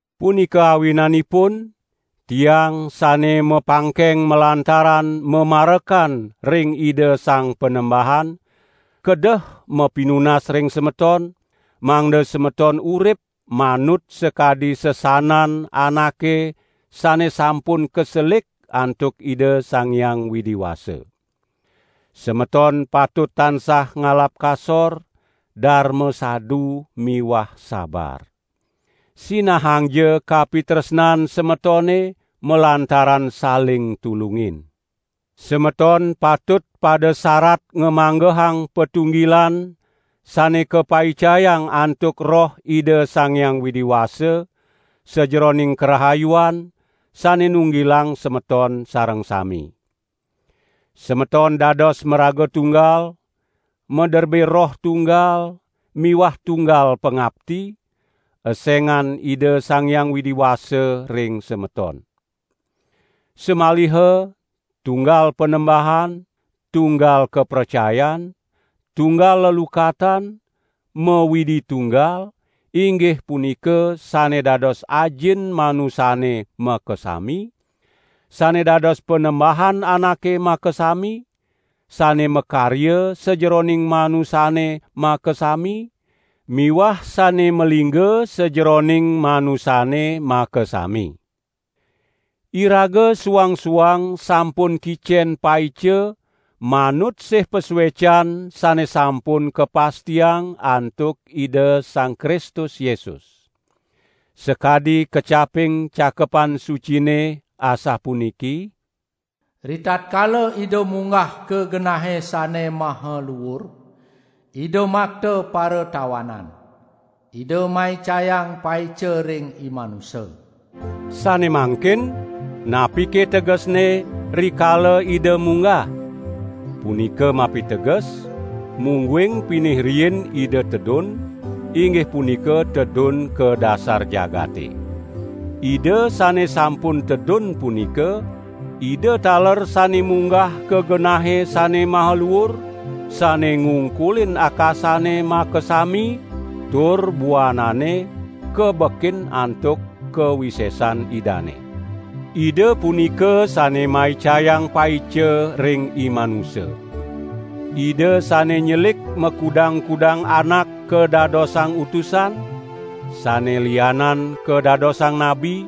Punika awinanipun tiang sane mapangkeng malantaran mamarekan ring Ida Sang Panembahan, kedeh mapinunas ring semeton, mangda semeton urip manut sakadi sesanan anake sane sampun kaselik antuk Ida Sang Hyang Widi Wasa. Semeton patut tansah ngalap kasor, darma sadu miwah sabar. Sinahangja kapitresnan semetone malantaran saling tulungin. Semeton patut pada sarat ngamanggehang patunggilan sane kapaicayang antuk Roh Ida Sang Hyang Widi Wasa, sajeroning karahayuan, sane nunggilang semeton sareng sami. Semeton dados maraga tunggal, maderbe Roh tunggal miwah tunggal pangapti, esengan Ida Sang Hyang Widi Wasa ring semeton. Samaliha tunggal Panembahan, tunggal kapracayan, tunggal lelukatan, ma-Widi tunggal inggih punika sane dados Ajin manusane makasami, sane dados Panembahan anake makasami, sane makarya sajeroning manusane makasami miwah sane malingga sajeroning manusane makasami. Iraga suang-suang sampun kicen paica manut sih pasuecan sane sampun kapastiang antuk Ida Sang Kristus Yesus. Sakadi kecaping Cakepan Sucine asapuniki: "Ritatkala Ida munggah ka genahe sane maha luur Ida makta paratawanan. Ida maicayang paica ring imanusa." Sane mangkin, napike tegesne: "Rikala Ida munggah"? Punika mapiteges, mungguing pinih riin Ida tedun, inggih punika tedun ka dasar jagate. Ida sane sampun tedun punika, Ida taler sane munggah ka genahe sane maha luur, sane ngungkulin akasane makasami tur buanane kabekin antuk kawisesan Idane. Ida punika sane maicayang paica ring imanusa. Ida sane nyelik makudang-kudang anak kadadosang utusan, sane lianan kadadosang nabi,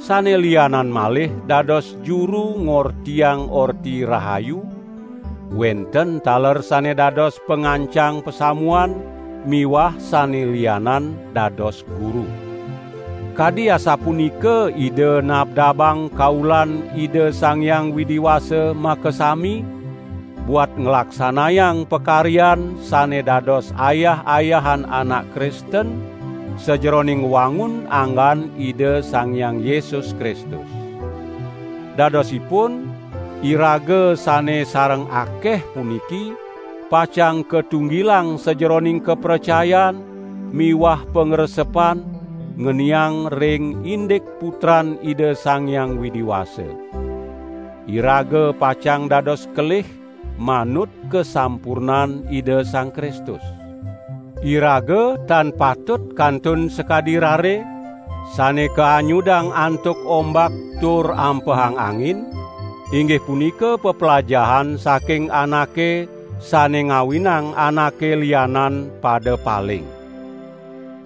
sane lianan malih dados juru ngortiang Orti Rahayu, wenten taler sane dados pangancang pasamuan miwah sane lianan dados guru. Kadi asapunika Ida nabdabang kaulan Ida Sang Hyang Widi Wasa makasami buat nglaksanayang pakaryan sane dados ayah-ayahan anak Kristen sajeroning ngwangun anggan Ida Sang Hyang Yesus Kristus. Dadosipun iraga sane sareng akeh puniki pacang katunggilang sajeroning kapracayan miwah pangresepan ngeniang ring indik Putran Ida Sang Hyang Widi Wasa. Iraga pacang dados kelih manut kasampurnan Ida Sang Kristus. Iraga tan patut kantun sakadi rare, sane kaanyudang antuk ombak tur ampehang angin, inggih punika peplajahan saking anake sane ngawinang anake lianan pada paling.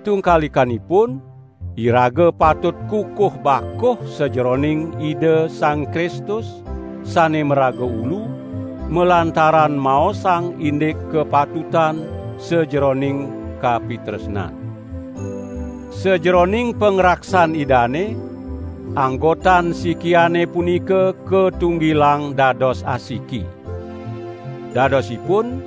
Tungkalikanipun iraga patut kukuh bakuh sajeroning Ida Sang Kristus, sane maraga Ulu, malantaran maosang indik kapatutan sajeroning kapitresnan. Sajeroning pangraksan Idane, anggotan sikiane punika katunggilang dados asiki. Dadosipun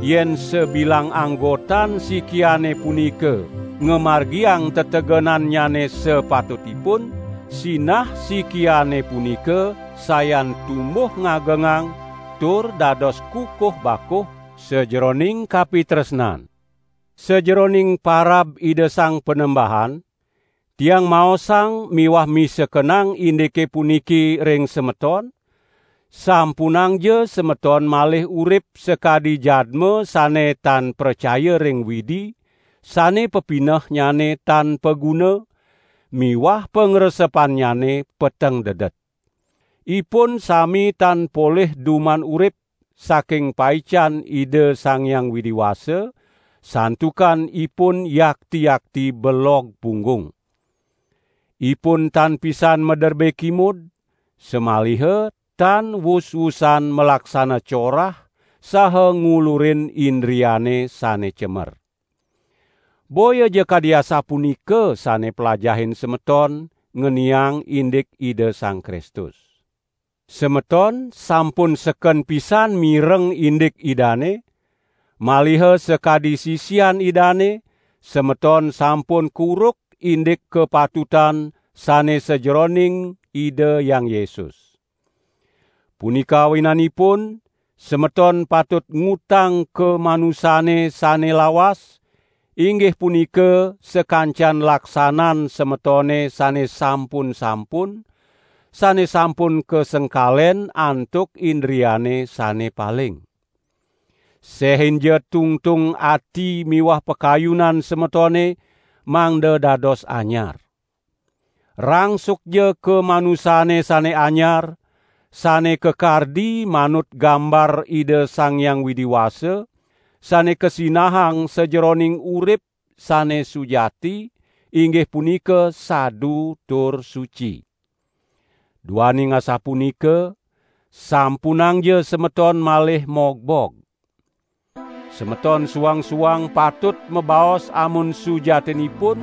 yen sabilang anggotan sikiane punika ngamargiang tetegenannyane sapatut ipun, sinah sikiane punika sayan tumbuh ngagengang tur dados kukuh bakuh sajeroning kapitresnan. Sajeroning parab Ida Sang Panembahan tiang maosang miwah misekenang indike puniki ring semeton: sampunangja semeton malih urip sakadi jadma sane tan pracaya ring Widi, sane pepinehnyane tan paguna, miwah pangresepannyane peteng dedet. Ipun sami tan polih duman urip, saking paican Ida Sang Hyang Widi Wasa, santukan ipun yakti-yakti belog punggung. Ipun tan pisan maderbe kimud, samaliha tan wus-wusan malaksana corah saha ngulurin indriane sane cemer. Boyaja kadi asapunika sane plajahin semeton ngeniang indik Ida Sang Kristus. Semeton sampun seken pisan mireng indik Idane, maliha sakadi sisian Idane, semeton sampun kuruk indik kapatutan sane sajeroning Ida Hyang Yesus. Punika awinanipun semeton patut ngutang kamanusane sane lawas, inggih punika sakancan laksanan semetone sane sampun-sampun, sane sampun kasengkalen antuk indriane sane paling. Sehinja tungtung ati miwah pakayunan semetone mangda dados anyar. Rangsukja kamanusane sane anyar, sane kakardi manut gambar Ida Sang Hyang Widi Wasa, sane kasinahang sajeroning urip sane sujati, inggih punika sadu tur suci. Duaning asapunika, sampunangja semeton malih mogbog! Semeton suang-suang patut mabaos amun sujatinipun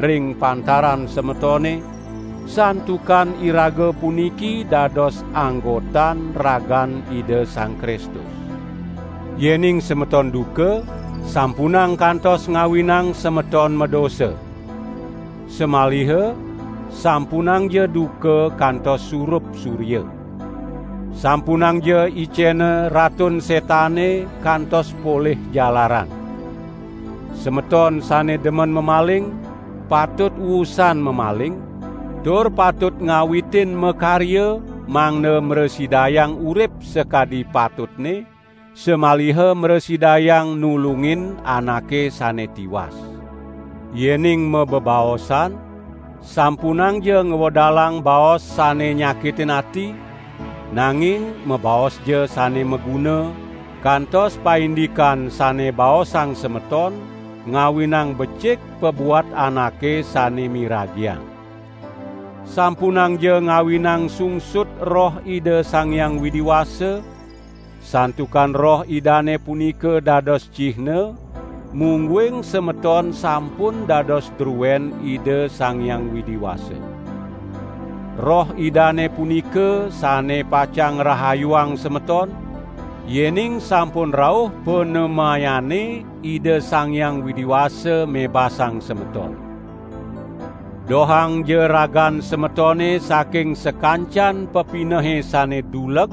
ring pantaran semetone, santukan iraga puniki dados anggotan ragan Ida Sang Kristus. Yening semeton duka, sampunang kantos ngawinang semeton madosa. Samaliha sampunangja duka kantos surup surya. Sampunangja icena Ratun Setane kantos polih jalaran. Semeton sane demen mamaling, patut wusan mamaling tur patut ngawitin makarya mangda mrasidayang urip sakadi patutne, samaliha mrasidayang nulungin anake sane tiwas. Yening mabebaosan, sampunangja ngwedalang baos sane nyakitin ati, nanging mabaosja sane maguna, kantos paindikan sane baosang semeton ngawinang becik pabuat anake sane miragiang. Sampunangja ngawinang sungsut Roh Ida Sang Hyang Widi Wasa, santukan Roh Idane punika dados cihna, mungguing semeton sampun dados druen Ida Sang Hyang Widi Wasa. Roh Idane punika sane pacang ngrahayuang semeton, yening sampun rauh panemayane Ida Sang Hyang Widi Wasa mebasang semeton. Dohangja ragan semetone saking sakancan pepinehe sane duleg,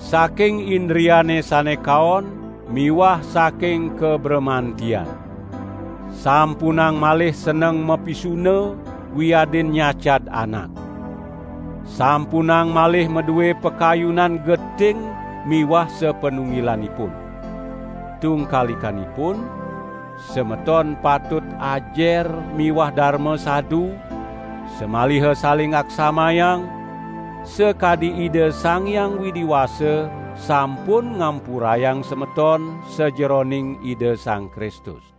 saking indriane sane kaon miwah saking kabramantian. Sampunang malih seneng mapisuna wiadin nyacad anak. Sampunang malih madue pakayunan geting miwah sapanunggilanipun. Tungkalikanipun, semeton patut ajer miwah darma sadu, samaliha saling aksamayang, sakadi Ida Sang Hyang Widi Wasa sampun ngampurayang semeton sajeroning Ida Sang Kristus.